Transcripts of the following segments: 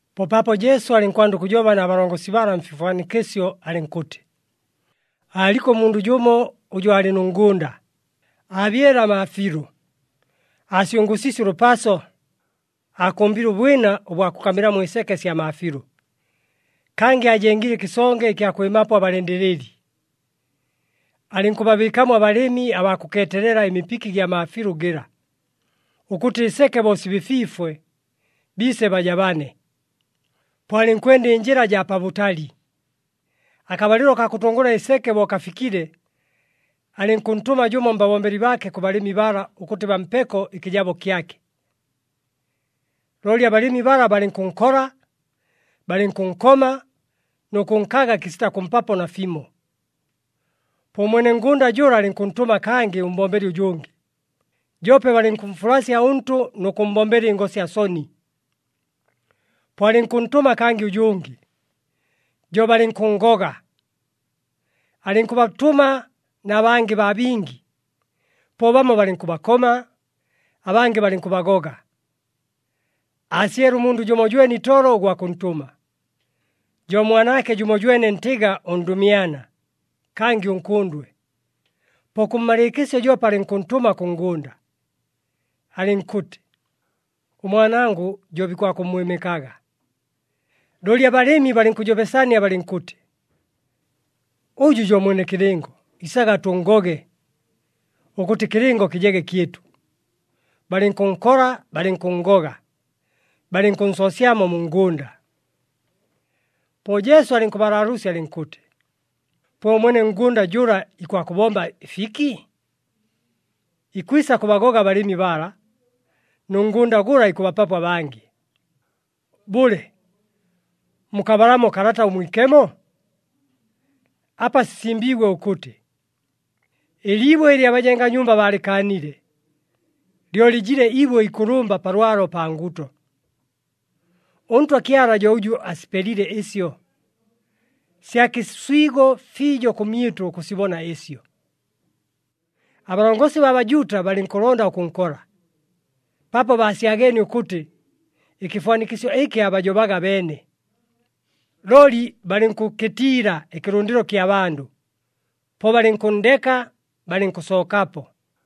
Po paapo Jesu alɨnkwanda ʉkʉjoba na balongosi bala mfifwanikɨsyo alɨnkʉtɨ, “Aaliko ʉmundʉ jʉmo ʉjʉ aalɨ nʉ ngʉnda. Aabyele amaafiilʉ, aasyʉngʉʉsiisye ʉlʉpaso, aakʉmbile ʉbwina ʉbwa kʉkamɨlamo ɨseke sya maafiilʉ, kangɨ aajengile ɨkɨsonge ɨkya kwɨmapo abalɨndɨlɨli. Alɨnkʉbabɨɨkamo abalɨmi abaa kʉkeetelela ɨmipiki gya maafiilʉ gɨla, ʉkʉtɨ ɨseke bo sibɨfwifwe, biise bajabane. Po alɨnkwenda ɨnjɨla jaa pabʉtali. Akabalɨlo kaa kʉtʉngʉla ɨseke bo kafikile, alɨnkʉntʉma jʉmo mbabombeli baake kʉ balɨmi bala ʉkʉtɨ bampeko ɨkɨjabo kyake. Looli abalɨmi bala balɨnkʉnkola, balɨnkʉnkoma nʉ kʉnkaga kɨsita kʉmpapo nafimo. Po ʉmwene ngʉnda jʉla alɨnkʉntʉma kangɨ ʉmbombeli ʉjʉngɨ, joope balɨnkʉmfulasya ʉntʉ nʉ kʉmmbombela ɨngosya soni. Po alɨnkʉntʉma kangɨ ʉjʉngɨ, jo balɨnkʉnngoga. Alɨnkʉbatʉma na bangɨ baa bingi, po bamo balɨnkʉbakoma, abangɨ balɨnkʉbagoga. Aasyele ʉmundʉ jʉmojwene itolo ʉgwa kʉntʉma, jo mwanaake jʉmojwene ntɨga ʉndʉmyana, kangɨ ʉnkʉndwe. Po kʉmmalɨɨkɨsyo joope alɨnkʉntʉma kʉ ngʉnda, alɨnkʉtɨ, ‘Ʉmwanangʉ jo bikwakʉmmwɨmɨkaga.’ Looli abalɨmi balɨnkʉjobesania balɨnkʉtɨ, ‘Ʉjʉ jo mwene kɨlɨngo. Isaga tʉnngoge, ʉkʉtɨ ɨkɨlɨngo kɨjege kyɨtʉ.’ Balɨnkʉnkola, balɨnkʉnngoga, balɨnkʉnsoosyamo mu ngʉnda.” Po Jesu alɨnkʉbalaalʉʉsya alɨnkʉtɨ, “Po ʉmwene ngʉnda jʉla ikwakʉbomba ɨfiki? Ikwisa kʉbagoga abalɨmi bala, nʉ ngʉnda gʉla ikʉbapapo abangɨ. Bʉle, mukabalamo Kalata ʉMwikemo? Apa sisimbiigwe ʉkʉtɨ, ‘Ɨliibwe ɨlɨ abajenga nyumba baalɨkaanile, lyo lɨjile ibwe ikʉlʉmba pa lwalo, pa nguto. ɄNtwa Kyala jo ʉjʉ asipelile ɨsyo, sya kɨswigo fiijo kʉmyɨtʉ ʉkʉsibona ɨsyo.’” Abalongosi baa Bajuuta balɨnkʉlonda ʉkʉnkola, paapo baasyageenie ʉkʉtɨ, ɨkɨfwanikɨsyo ɨkɨ aabajobaga abeene. Looli balɨnkʉkɨtiila ɨkɨlʉndɨlo kya bandʉ, po balɨnkʉnndeka, balɨnkʉsookapo.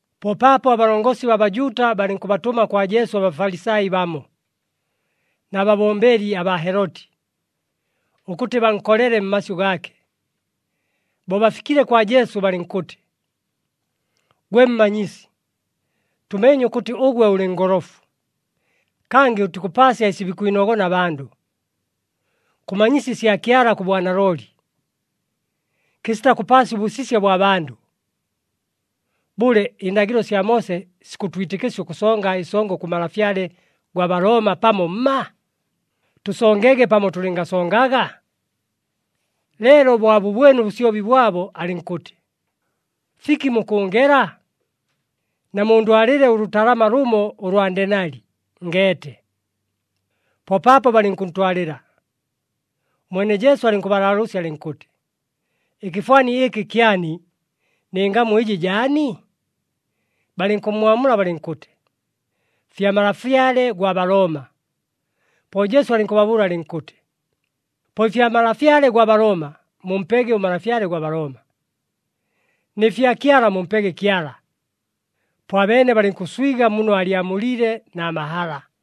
Po paapo abalongosi baa Bajuuta balɨnkʉbatʉma kwa Jesu aBafalisai bamo, na babombeli abaa Heloti, ʉkʉtɨ bankolele mmasyʉ gaake. Bo bafikile kwa Jesu balɨnkʉtɨ, “Gwe Mmanyisi, tʉmeenye ʉkʉtɨ ʉgwe ʉlɨ ngolofu, kangɨ ʉtikʉpaasya ɨsi bikwinogona abandʉ. Kʉmanyisya ɨsya Kyala kʉ bwanalooli, kɨsita kʉpaasya ʉbʉsisya bwa bandʉ. Bʉle, ɨndagɨlo sya Moose sikʉtwitɨkɨsya ʉkʉsonga ɨsongo kʉ malafyale gwa Balooma, pamo mma? Tʉsongege pamo tʉlɨngasongaga?” Leelo bo abʉbwene ʉbʉsyobi bwabo alɨnkʉtɨ, “Fiki mukʉʉngela? Namundwalɨle ʉlʉtalama lʉmo ʉlwa ndenali, ngeete.” Po paapo balɨnkʉntwalɨla. Ʉmwene Jesu alɨnkʉbalaalʉʉsya alɨnkʉtɨ, “Ɨkɨfwani ɨkɨ kyani, nɨ ngamu ɨjɨ jaani?” Balɨnkʉmmwamula balɨnkʉtɨ, “Fya malafyale gwa Balooma.” Po Jesu alɨnkʉbabʉʉla alɨnkʉtɨ, “Po ɨfya malafyale gwa Balooma mumpege ʉmalafyale gwa Balooma, nɨ fya Kyala mumpege Kyala.” Po abeene balɨnkʉswiga muno aalyamuliile na mahala.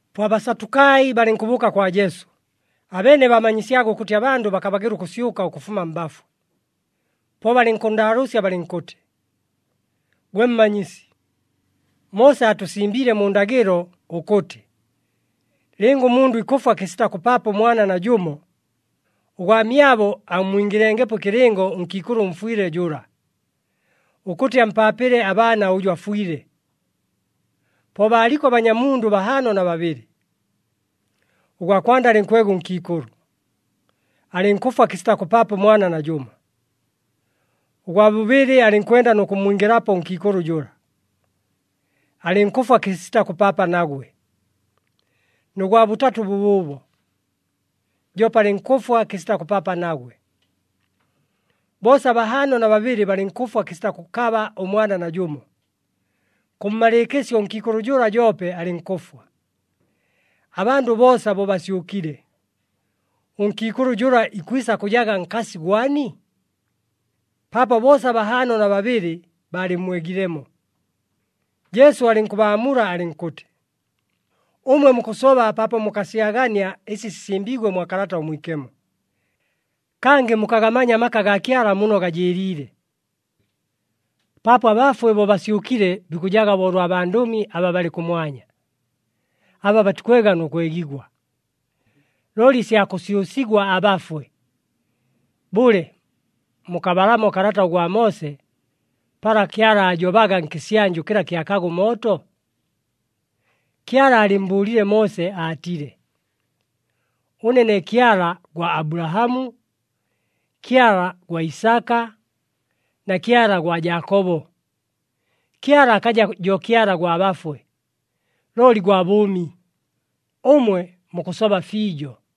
Po aBasatukai balɨnkʉbʉʉka kwa Jesu. Abeene baamanyisyaga ʉkʉtɨ abandʉ bakabagɨla ʉkʉsyʉka ʉkʉfuma mbafwe. Po balɨnkʉnndaalʉʉsya balɨnkʉtɨ, “Gwe Mmanyisi, Moose aatʉsimbiile mu ndagɨlo, ʉkʉtɨ, ‘Lɨnga ʉmundʉ ikʉfwa kɨsita kʉpaapa ʉmwana najʉmo, ʉgwamyabo ammwingɨlengepo ɨkɨlɨngo ʉnkiikʉlʉ ʉmfwɨle jʉla, ʉkʉtɨ ampaapɨle abaana ʉjʉ afwile.’ Po baaliko abanyamundʉ bahaano na babɨlɨ. Ʉgwa kwanda alɨnkwega ʉnkiikʉlʉ, alɨnkʉfwa kɨsita kʉpaapa ʉmwana najʉmo. Ʉgwa bʉbɨlɨ, alɨnkwenda nʉ kʉmmwingɨlapo ʉnkiikʉlʉ jʉla, alɨnkʉfwa kɨsita kʉpaapa nagwe, nʉ gwa bʉtatʉ bʉbʉʉbo, joope alɨnkʉfwa kɨsita kʉpaapa nagwe. Boosa bahaano na babɨlɨ balɨnkʉfwa kɨsita kʉkaba ʉmwana najʉmo. Kʉmmalɨɨkɨsyo ʉnkiikʉlʉ jʉla joope alɨnkʉfwa. Abandʉ boosa bo basyʉkile, ʉnkiikʉlʉ jʉla ikwisa kʉjaga nkasi gwani? Paapo boosa bahaano na babɨlɨ baalɨmmwegilemo.” Jesu alɨnkʉbaamula alɨnkʉtɨ, “Ʉmwe mukʉsoba paapo mukasyagania ɨsi sisimbiigwe mwa Kalata ʉMwikemo, kangɨ mukagamanya amaka gaa Kyala muno gajɨɨliile. Paapo abafwe bo basyʉkile, bikʉjaga bo ʉlwa bandʉmi aba balɨ kʉmwanya, aba batikwega nʉ kwegigwa. Looli ɨsya kʉsyʉsigwa abafwe, bʉle mukabalamo kalata ʉgwa Moose, pala Kyala aajobaga nkɨsyanjʉ kɨla kyakaga ʉmooto? Kyala aalɨmmbʉʉlile Moose aatile, ‘Ʉne ne Kyala gwa Abulahamu, Kyala gwa Isaka na Kyala gwa Jaakobo.’ Kyala akaja jo Kyala gwa bafwe, looli gwa bʉʉmi. Ʉmwe mukʉsoba fiijo.”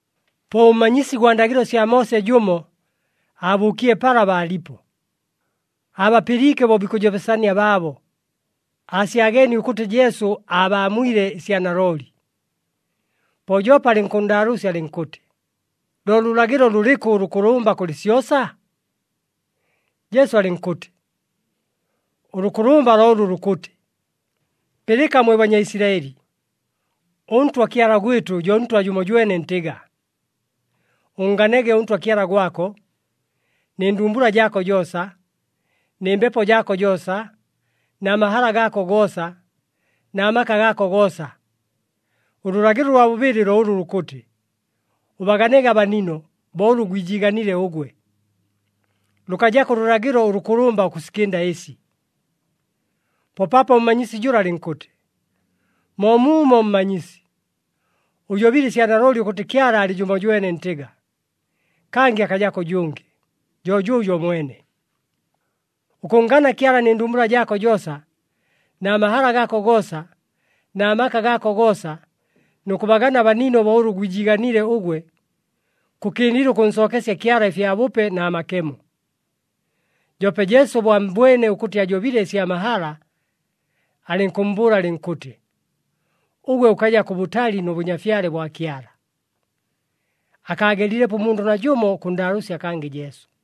Po ʉmmanyisi gwa ndagɨlo sya Moose jʉmo, aabʉʉkile pala baalipo. Aabapɨliike bo bikʉjobesania baabo, aasyageenie ʉkʉtɨ Jesu aabaamwile ɨsya nalooli. Po joope alɨnkʉnndaalʉʉsya alɨnkʉtɨ, “Lo lʉlagɨlo lʉlɨkʉ ʉlʉkʉlʉmba kʉlɨ syosa?” Jesu alɨnkʉtɨ, “Ʉlʉkʉlʉmba lo ʉlʉ lukʉtɨ, ‘Pɨlɨka mwe Banyaisilaɨli! ɄNtwa Kyala gwɨtʉ jo Ntwa jʉmojwene ntɨga. Ʉnnganege ʉNtwa Kyala gwako nɨ ndumbula jaako joosa, nɨ mbepo jaako joosa, na mahala gaako goosa, na maka gaako goosa!’ Ʉlʉlagɨlo ʉlwa bʉbɨlɨ lo ʉlʉ lukʉtɨ, ‘Ʉbaganege abanino bo ʉlʉ gwijiiganile ʉgwe.’ Lʉkajako ʉlʉlagɨlo ʉlʉkʉlʉmba ʉkʉsikɨnda ɨsi.” Po paapo ʉmmanyisi jʉla alɨnkʉtɨ, “Moomuumo Mmanyisi! Ʉjobile ɨsya nalooli ʉkʉtɨ Kyala alɨ jʉmojwene ntɨga, kangɨ akajako ʉjʉngɨ, jo jʉʉjo mwene. Ʉkʉnngana Kyala nɨ ndumbula jaako joosa, na mahala gaako goosa, na maka gaako goosa, nʉ kʉbagana abanino bo ʉlʉ gwijiiganile ʉgwe, kʉkɨndile ʉkʉnsookesya Kyala ɨfyabʉpe na makemo.” Joope Jesu bo ammbwene ʉkʉtɨ ajobile ɨsya mahala alɨnkʉmmbʉʉla alɨnkʉtɨ, “Ʉgwe ʉkaja kʉbʉtali nʉ Bʉnyafyale bwa Kyala.” Akaagelilepo ʉmundʉ najʉmo ʉkʉnndaalʉʉsya kangɨ Jesu.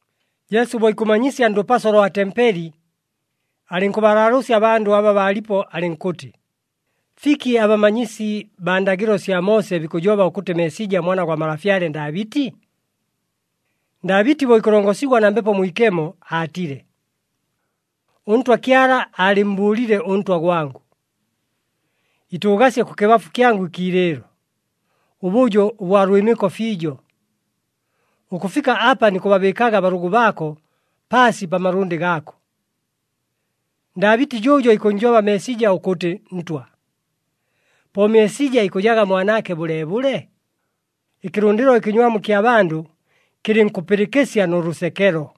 Jesu bo ikʉmanyisya ndʉpaso lwa tempeli, alɨnkʉbalaalʉʉsya abandʉ aba baalipo alɨnkʉtɨ, “Fiki abamanyisi baa ndagɨlo sya Moose bikʉjoba ʉkʉtɨ Meesija Mwana gwa malafyale Ndaabɨti? Ndaabɨti bo ikʉlongosigwa na Mbepo Mwikemo aatile, ‘ɄNtwa Kyala aalɨmmbʉʉlile ʉNtwa gwangʉ, “Itʉʉgasye kʉkɨbafu kyangʉ ɨkiilɨɨlo, ʉbʉjo ʉbwa lwɨmɨko fiijo, ʉkʉfika apa nikʉbabɨɨkaga abalʉgʉ baako paasi pa malʉndɨ gaako.” ’ “Ndaabɨti jʉʉjo ikʉnnjoba Meesija ʉkʉtɨ Ntwa. Po Meesija ikʉjaga mwanaake bʉleebʉle?” Ɨkɨlʉndɨlo ɨkɨnywamu kya bandʉ kɨlɨnkʉpɨlɨkɨsya nʉ lʉsekelo.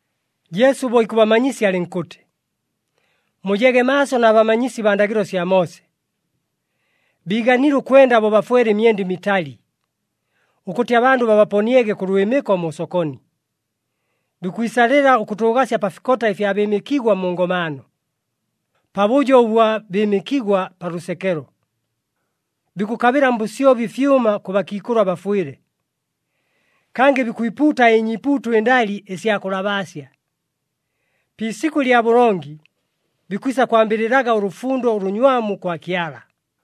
Jesu bo ikʉbamanyisya alɨnkʉtɨ, “Mujege maaso na bamanyisi baa ndagɨlo sya Moose! Biiganile ʉkwenda bo bafwele ɨmyenda ɨmitali, ʉkʉtɨ abandʉ babaponiege kʉ lwɨmɨko mu sokoni. Bikwisalɨla ʉkʉtʉʉgasya pa fikota ɨfya bɨɨmɨkigwa mu ngomaano, pabʉjo ʉbwa bɨɨmɨkigwa pa lʉsekelo. Bikʉkabɨla mbʉsyobi ɨfyʉma kʉ bakiikʉlʉ abafwɨle, kangɨ bikwipuuta ɨnyiipuuto ɨndali, ɨsya kʉlabaasya. Pi isikʉ lya bʉlongi, bikwisa kwambɨlɨlaga ʉlʉfundo ʉlʉnywamu kwa Kyala!”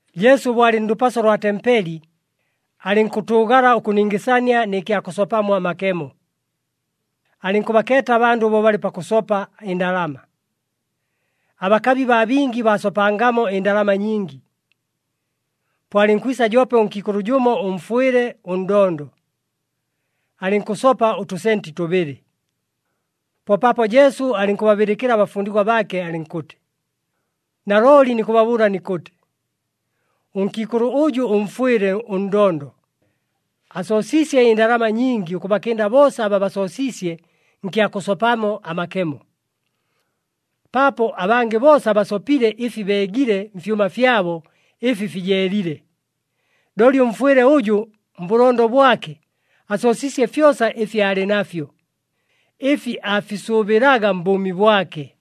Jesu bo alɨ ndʉpaso lwa tempeli, alɨnkʉtʉʉgala ʉkʉningɨsania nɨ kya kʉsopamo amakemo. Alɨnkʉbakeeta abandʉ bo balɨ pakʉsopa ɨndalama. Abakabi baa bingi baasopangamo ɨndalama nyingi. Po alɨnkwisa joope ʉnkiikʉlʉ jʉmo ʉmfwɨle ʉndondo, alɨnkʉsopa ʉtʉsenti tʉbɨlɨ. Po paapo Jesu alɨnkʉbabɨlɨkɨla abafundigwa baake alɨnkʉtɨ, “Nalooli nikʉbabʉʉla nikʉtɨ, ʉnkiikʉlʉ ʉjʉ ʉmfwɨle ʉndondo, asoosiisye ɨndalama nyingi ʉkʉbakɨnda boosa aba basoosiisye nkya kʉsopamo amakemo. Paapo abangɨ boosa basopile ɨfi beegile mfyʉma fyabo ɨfi fijeelile, looli ʉmfwɨle ʉjʉ mbʉlondo bwake asoosiisye fyosa ɨfi aalɨ nafyo, ɨfi aafisʉʉbɨlaga mbʉʉmi bwake.”